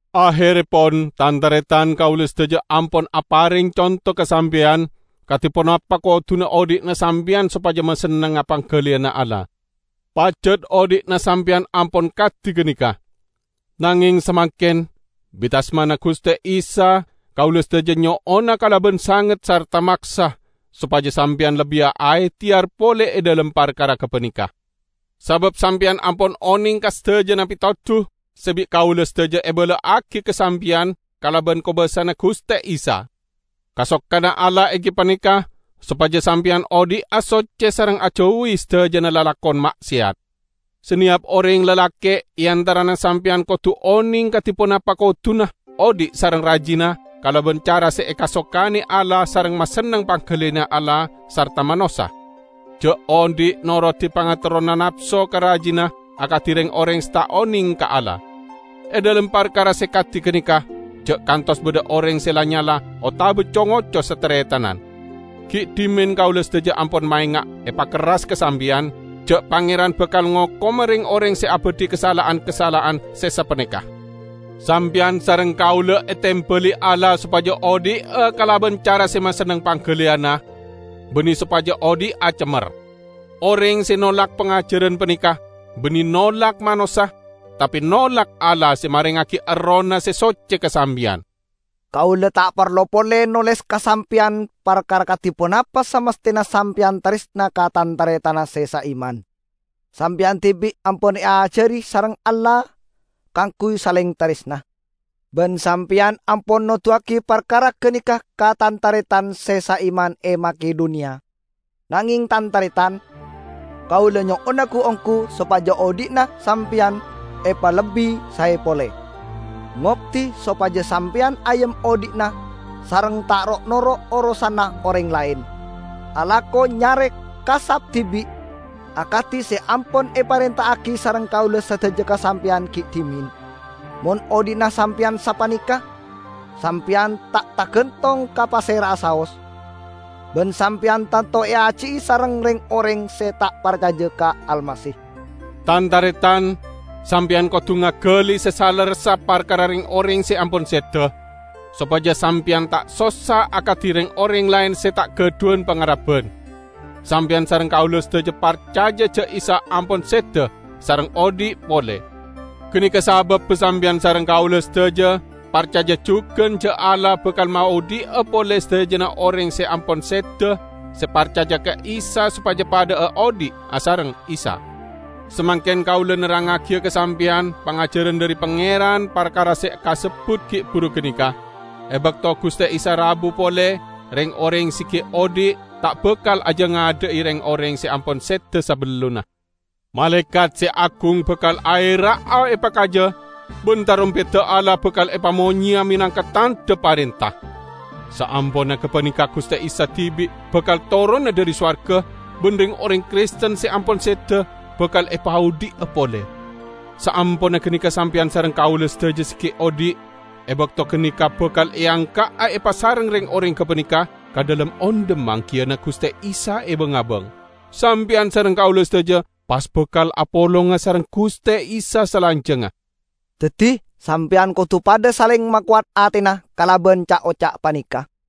Aherrepon! Tan-taretan, kaula sadaja ampon apareng conto ka sampeyan kadi ponapa koduna odhi'na sampeyan sopaja masennengnga panggaliyanna Allah. Pajat odhi'na sampeyan ampon kadi ganeka. Nangeng samangken, bit asmana Guste Isa kaula sadaja nyo'ona kalaban sanget sarta maksa sopaja sampeyan lebbiya aehteyar pole e dhalem parkara gapaneka! Sabab sampeyan ampon oneng ka sadajana petodu se bi' kaula sadaja ebala'agi ka sampeyan kalaban kobasana Guste Isa. Kasokanna Allah enggi paneka sopaja sampeyan odhi'a socce sareng ajauwi sadajana lalakon ma'seyat. Saneyap oreng lalake' e antarana sampeyan kodu oneng kadi ponapa koduna odhi' sareng rajina kalaban cara se ekasokane Allah sareng masenneng panggaliyanna Allah sarta manossa. Ja' odhi' norodi pangaterrona napso ka rajina akadi reng-oreng se ta' oneng ka Allah. E dhalem parkara se kadi ganeka, ja' kantos badha oreng se la-nyala otaba co-ngoco sataretanan. Gi' dhimen kaula sadaja ampon maenga' epakerras ka sampeyan, ja' Pangeran bakal ngokoma reng-oreng se abadhi kasala'an-kasala'an se sapaneka. Sampeyan sareng kaula etembali Allah sopaja odhi'a kalaban cara se masenneng panggaliyanna, banne sopaja odhi'a cemmer. Oreng se nolak pangajaran paneka, banne nolak manossa, tape nolak Allah se marengngagi Errohna se socce ka sampeyan. Kaula ta' parlo pole noles ka sampeyan parkara kadi ponapa samasthena sampeyan taresna ka tan-taretanna se saiman. Sampeyan dibi' ampon eajari sareng Allah kaangguy saleng taresna. Ban sampeyan ampon noduwagi parkara ganeka ka tan-taretan se saiman e Makedoniya. Nangeng, tan-taretan, kaula nyo'ona gu-onggu sopaja odhi'na sampeyan epalebbi sae pole. Ngoddi sopaja sampeyan ayem odhi'na sareng ta' ro'-noro' orosanna oreng laen; alako nyare kasap dibi', akadi se ampon eparenta'agi sareng kaula sadaja ka sampeyan gi' dhimen. Mon odhi'na sampeyan sapaneka, sampeyan ta' targantong ka pasera'a saos, ban sampeyan tanto eaji'i sareng reng-oreng se ta' parcaja ka Almasih. Tan-taretan, sampeyan kodu ngagali se salerressa parkara reng-oreng se ampon seda, sopaja sampeyan ta' sossa akadi reng-oreng laen se ta' gadhuwan pangarebban. Sampeyan sareng kaula sadaja parcaja ja' Isa ampon seda sareng odhi' pole; ganeka sababba sampeyan sareng kaula sadaja parcaja jugan ja' Allah bakal maodhi'a pole sadajana oreng se ampon seda, se parcaja ka Isa sopaja padha'a odhi' asareng Isa. Samangken kaula nerrangngagiya ka sampeyan pangajaran dhari Pangeran parkara se kasebbut gi' buru ganeka: E bakto Guste Isa rabu pole, reng-oreng se gi' odhi' ta' bakal ajangadha'i reng-oreng se ampon seda sabellunna. Malaekat se agung bakal aera'a epakaja, ban tarompedda Allah bakal epamonyeya menangka tandha parenta. Saamponna gapaneka Guste Isa dibi' bakal torona dhari sowarga, ban reng-oreng Kristen se ampon seda bakal epaodhi'a pole. Saamponna ganeka sampeyan sareng kaula sadaja se gi' odhi' e bakto ganeka bakal eangka'a epasareng reng-oreng gapaneka ka dhalem ondhem manggiyana Guste Isa e bang-abang. Sampeyan sareng kaula sadaja pas bakal apolonga sareng Guste Isa salanjangnga. Daddi sampeyan kodu padha saleng makowat atena kalaban ca'-oca' paneka.